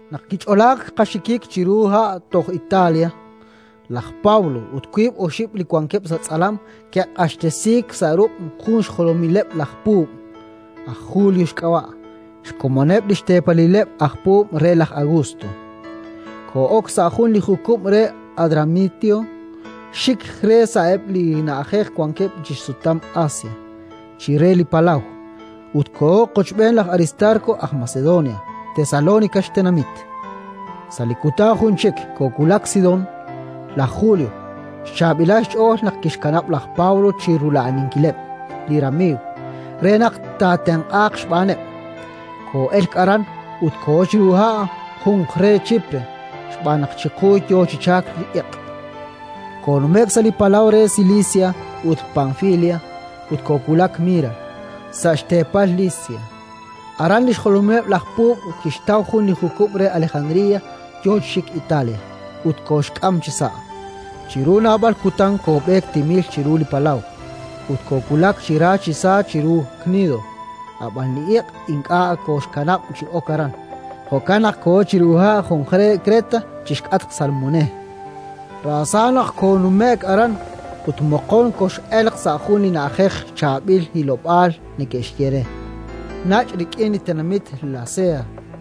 Naq kich'olaak qaxikik chiru ha' toj Italia, laj Pablo ut wiib' oxib' li wankeb' sa' tz'alam ke'q'axtesiik sa' ruq' jun xjolomileb' laj puub', aj Julio xk'ab'a', xkomoneb' li xteepalileb' aj puub' re laj Augusto. Koo'ok sa' jun li jukub' re Adramitio, xik re sa'eb' li na'ajej wankeb' chi xsutam Asia, chire li palaw, ut kooho qochb'een laj Aristarko aj Macedonia, Tesalónica xtenamit. Sa' li kutan jun chik koowulak Sidón. Laj Julio xchaab'ilal xch'ool naq kixkanab' laj Pablo chi rula'aninkileb' li ramiiw, re naq taatenq'aaq xb'aaneb'. Koo'elk aran Sidón ut kooho chiru ha' junqre Chipre, xb'aan naq chiqu yo chi chalk li iq'. Koonume'k sa' li palaw re Silisia ut Panfilia, ut koowulak Mira, sa' xteepal Lisia. Aran li xjolomileb' laj puub' kixtaw jun li jukub' re Alejandría yo chi xik Italia, ut kooxk'am chisa'. Chiru naab'al kutan koob'eek timil chiru li palaw ut koowulak chi ra chi sa chiru Knido; ab'an li iq' ink'a' kooxkanab' chi ok aran, jo'kan naq kooho chiru ha' junqre Kreta, chi xk'atq Salmone: raasa naq koonume'k aran ut, moqon, koxoo'elq sa' jun li na'ajej Chaab'il Hilob'aal neke'xye re, nach' rik'in li tenamit Lasea.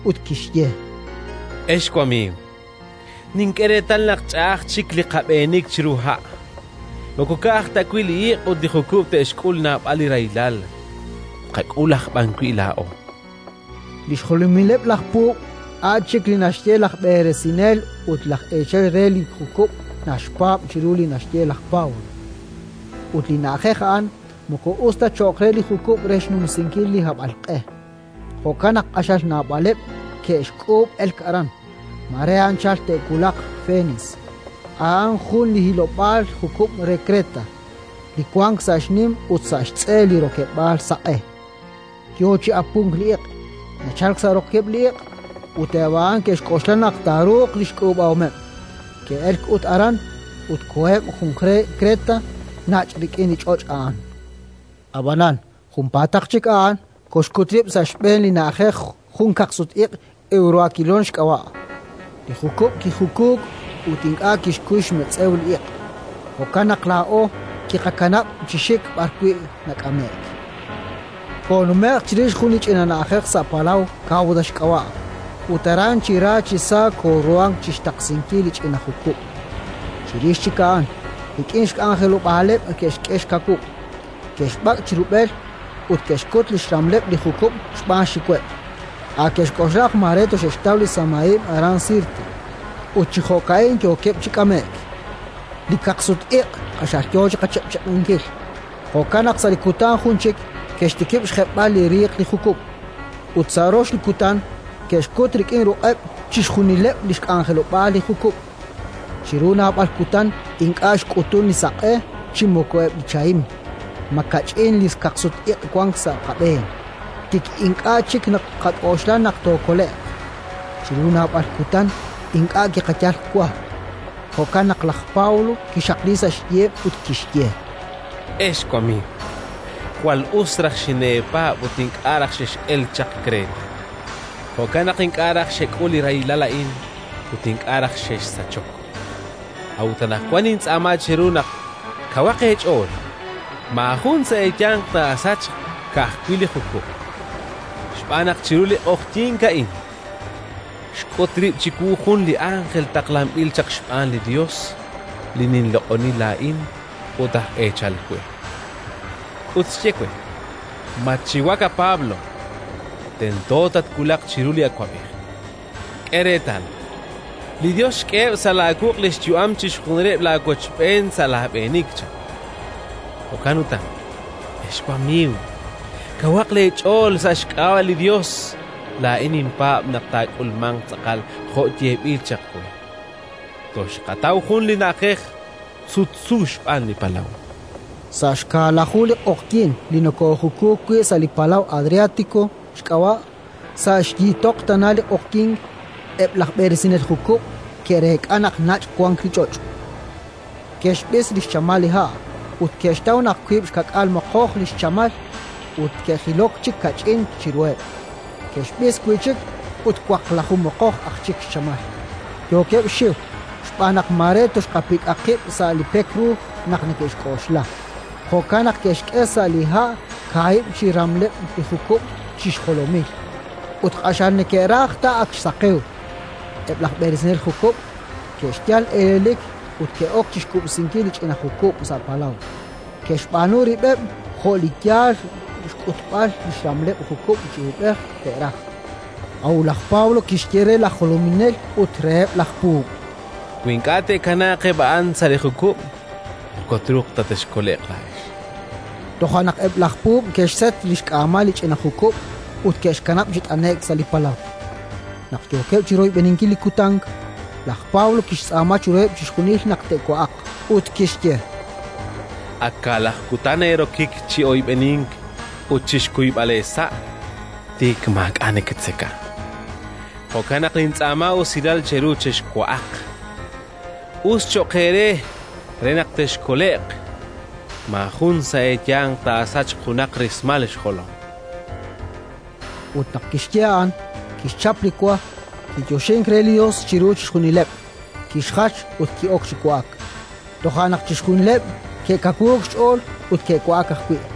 ut kixye: —Ex wamiiw, nink'e reetal naq ch'a'aj chik li qab'eenik chiru ha'; moko ka'aj ta wi' li iiq ut li jukub' te'xk'ul naab'al li rahilal, tqak'ul aj b'an wi' laa'o. Li xjolomileb' laj puub' a' chik li naxye laj b'eresinel ut laj eechal re li jukub' naxpaab' chiru li naxye laj Pablo. Ut li na'ajej a'an moko us ta cho'q re li jukub' re xnumsinkil li hab'alq'e; jo'kan naq q'axal naab'aleb' ke'xk'uub' elk aran: mare anchal te'wulaq Fenis, a'an jun li hilob'aal jukub' re Kreta, li wank sa' xnim ut sa' xtz'e li rokeb'l saq'e. Yo chi apunk li iq' nachalk sa' rokeb'l li iq', ut eb' a'an ke'xk'oxla naq taaruuq li xk'uub'ahomeb'; ke'elk ut aran, ut koheb' junqre Kreta, nach' rik'in li ch'och' a'an. Ab'anan junpaataq chik a'an koxkut rib' sa' xb'een li na'ajej jun kaqsut-iq', Ewroakilón xk'ab'a': li jukub' kijukuuk ut ink'a' kixkuy xmetz'ew li iq', jo'kan naq laa'o kiqakanab' chi xik b'arwi' nak'ame'k. Koonume'k chirix jun li ch'ina na'ajej sa' palaw, Kawda xk'ab'a', ut aran chi ra chi sa kooruhank chi xtaqsinkil li ch'ina jukub'. Chirix chik a'an, rik'in xk'anjelob'aaleb' ke'xk'e xkawub'; ke'xb'ak' chi rub'el ut ke'xkut li xramleb' li jukub' xb'aan xxiweb': a' ke'xk'oxla naq mare toxe'xtaw li samahib' aran Sirte. Ut chi jo'ka'in yookeb' chi k'ame'k. Li kaqsut-iq' q'axal yo chi qachiq'chiq'inkil, jo'kan naq sa' li kutan jun chik ke'xtikib' xjeb'b'al li riiq li jukub', ut sa' rox li kutan ke'xkut rik'in ruq'eb' chixjunileb' li xk'anjelob'aal li jukub'. Chiru naab'al kutan ink'a' xk'utunk li saq'e chi moko eb' li chahim; makach'in li kaqsut-iq' wank sa' qab'een, tik ink'a' chik naqak'oxla naq tookole'q. Chiru naab'al kutan ink'a' kiqayal wa; jo'kan naq laj Pablo kixaqliik sa' xyiheb' ut kixye: —Ex wamiiw, jwal us raj xineepaab' ut ink'a' raj xex'elk chaq Kreta; jo'kan naq ink'a' raj xek'ul li rahilal a'in ut ink'a' raj xexsachok. A'ut anaqwan nintz'aama cheru naq kawaq eech'ool: maajun sa' eeyanq taasachq, ka'ajwi' li jukub'. Xb'aan naq chiru li q'oqyink a'in xk'ut rib' chiwu jun li ánjel taqlanb'il chaq xb'aan li Yos li ninloq'oni laa'in ut aj eechal we, ut xye we: «Matxiwak, Pablo! Tento tatwulaq chiru li awab'ej. K'e reetal, li Yos xk'eheb' sa' laawuq' li xyu'am chixjunileb' laawochb'een sa' laab'eenik», chan. Jo'kan utan, ex wamiiw, kawaq eech'ool! Sa' xk'ab'a' li Yos laa'in ninpaab' naq taak'ulmanq tz'aqal jo' yeeb'il chaq we. Toxqataw jun li na'ajej sutsu xb'aan li palaw. Sa' xkaalaju li q'oqyink li nokoojukuuk wi' sa' li palaw Adriátiko xk'ab'a', sa' xyiitoq tana li q'oqyink, eb' laj b'eresinel jukub' ke'reek'a naq nach' wank li ch'och'. Ke'xb'is li xchamal li ha' ut ke'xtaw naq wiib' xka'k'aal moqoj li xchamal; ut naq ke'jilok chik kach'in chiruheb', ke'xb'is wi' chik ut waqlaju moqoj aj chik xchamal. Yookeb' xxiw xb'aan naq mare toxqapik'a qib' sa' li pek ru naq neke'xk'oxla; jo'kan naq ke'xk'e sa' li ha' kaahib' chi xramleb' li jukub' chi xjolomil, ut q'axal neke'raj ta ak xsaqewk. Eb' laj b'eresinel jukub' ke'xyal elelik ut ke'ok chi xkub'sinkil li ch'ina jukub' sa' palaw, ke'xb'aanu rib'eb' jo' li yal xkutb'al li xramleb' jukub' chi uub'ej te'raj. A'ut laj Pablo kixye re laj jolominel ut reheb' laj puub': —Wi ink'a' te'kanaaq eb' a'an sa' li jukub', moko truuq ta texkole'q laa'ex. Toja' naq eb' laj puub' ke'xset li xk'aamal li ch'ina jukub' ut ke'xkanab' chi t'ane'k sa' li palaw. Naq yookeb' chi royb'eninkil li kutan, laj Pablo kixtz'aama chiruheb' chixjunil naq te'wa'aq; ut kixye: —Ak kaalaju kutan eerokik chi oyb'enink ut chi xkuyb'al eesa'; tik maak'a' neketzeka. Jo'kan naq nintz'aama usilal cheru, chexwa'aq: us cho'q eere, re naq texkole'q. Maajun sa' eeyanq taasachq junaq rismal xjolom. Ut naq kixye a'an, kixchap li wa, kiyoxink re li Yos chiru chixjunileb', kixjach ut ki'ok chi wa'ak. Toja' naq chixjunileb' ke'kawuuk xch'ool ut ke'wa'ak ajwi'.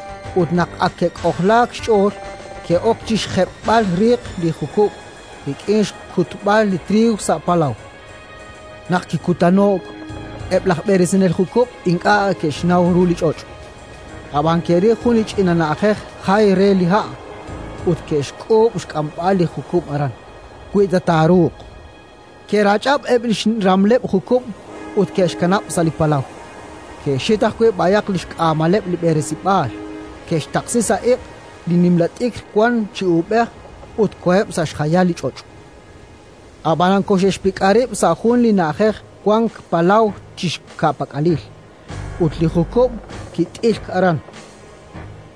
Ut naq ak ke'k'ojlaak xch'ool, ke'ok chi xjeb'b'al riiq li jukub' rik'in xkutb'al li triiw sa' palaw. Naq kikutano'k, eb' laj b'eresinel jukub' ink'a' ke'xnaw ru li ch'och', ab'an ke'ril jun li ch'ina na'ajej jay re li ha', ut ke'xk'uub' xk'amb'al li jukub' aran, wi ta taaruuq. Ke'rach'ab' eb' li xramleb' jukub' ut ke'xkanab' sa' li palaw; ke'xhit ajwi' b'ayaq li xk'aamaleb' li b'eresib'aal, ke'xtaqsi sa' iq' li nimla t'ikr wank chi uub'ej ut koheb' sa' xjayal li ch'och'. Ab'anan koxe'xpik'a rib' sa' jun li na'ajej wank palaw chi xka'pak'alil, ut li jukub' kit'ilk aran: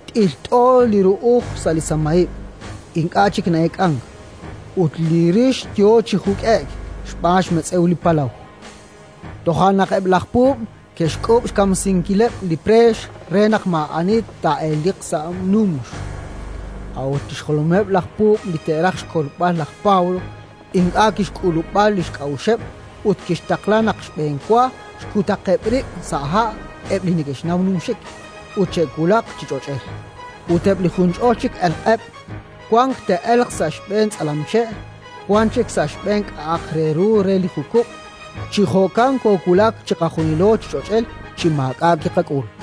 t'ilt'o li ru'uj sa' li samahib', ink'a' chik na'eek'ank; ut li rix yo chi juk'e'k xb'aan xmetz'ew li palaw. Toja' naq eb' laj puub' ke'xk'uub' xkamsinkileb' li preex re naq maa'ani taa'eleliq sa' numx. A'ut li xjolomileb' laj puub' li taaraj xkolb'al laj Pablo, ink'a' kixk'ulub'a li xk'a'uxeb' ut kixtaqla naq xb'enwa xkutaqeb' rib' sa' ha' eb' li neke'xnaw numxik ut che'wulaq chi ch'och'el; ut eb' li junch'ol chik elqeb': wan te'elq sa' xb'een tz'alamche', wan chik sa' xb'een li k'a'aq re ru re li jukub'. Chi jo'kan koowulak chiqajunilo chi ch'och'el chi maak'a' kiqak'ul.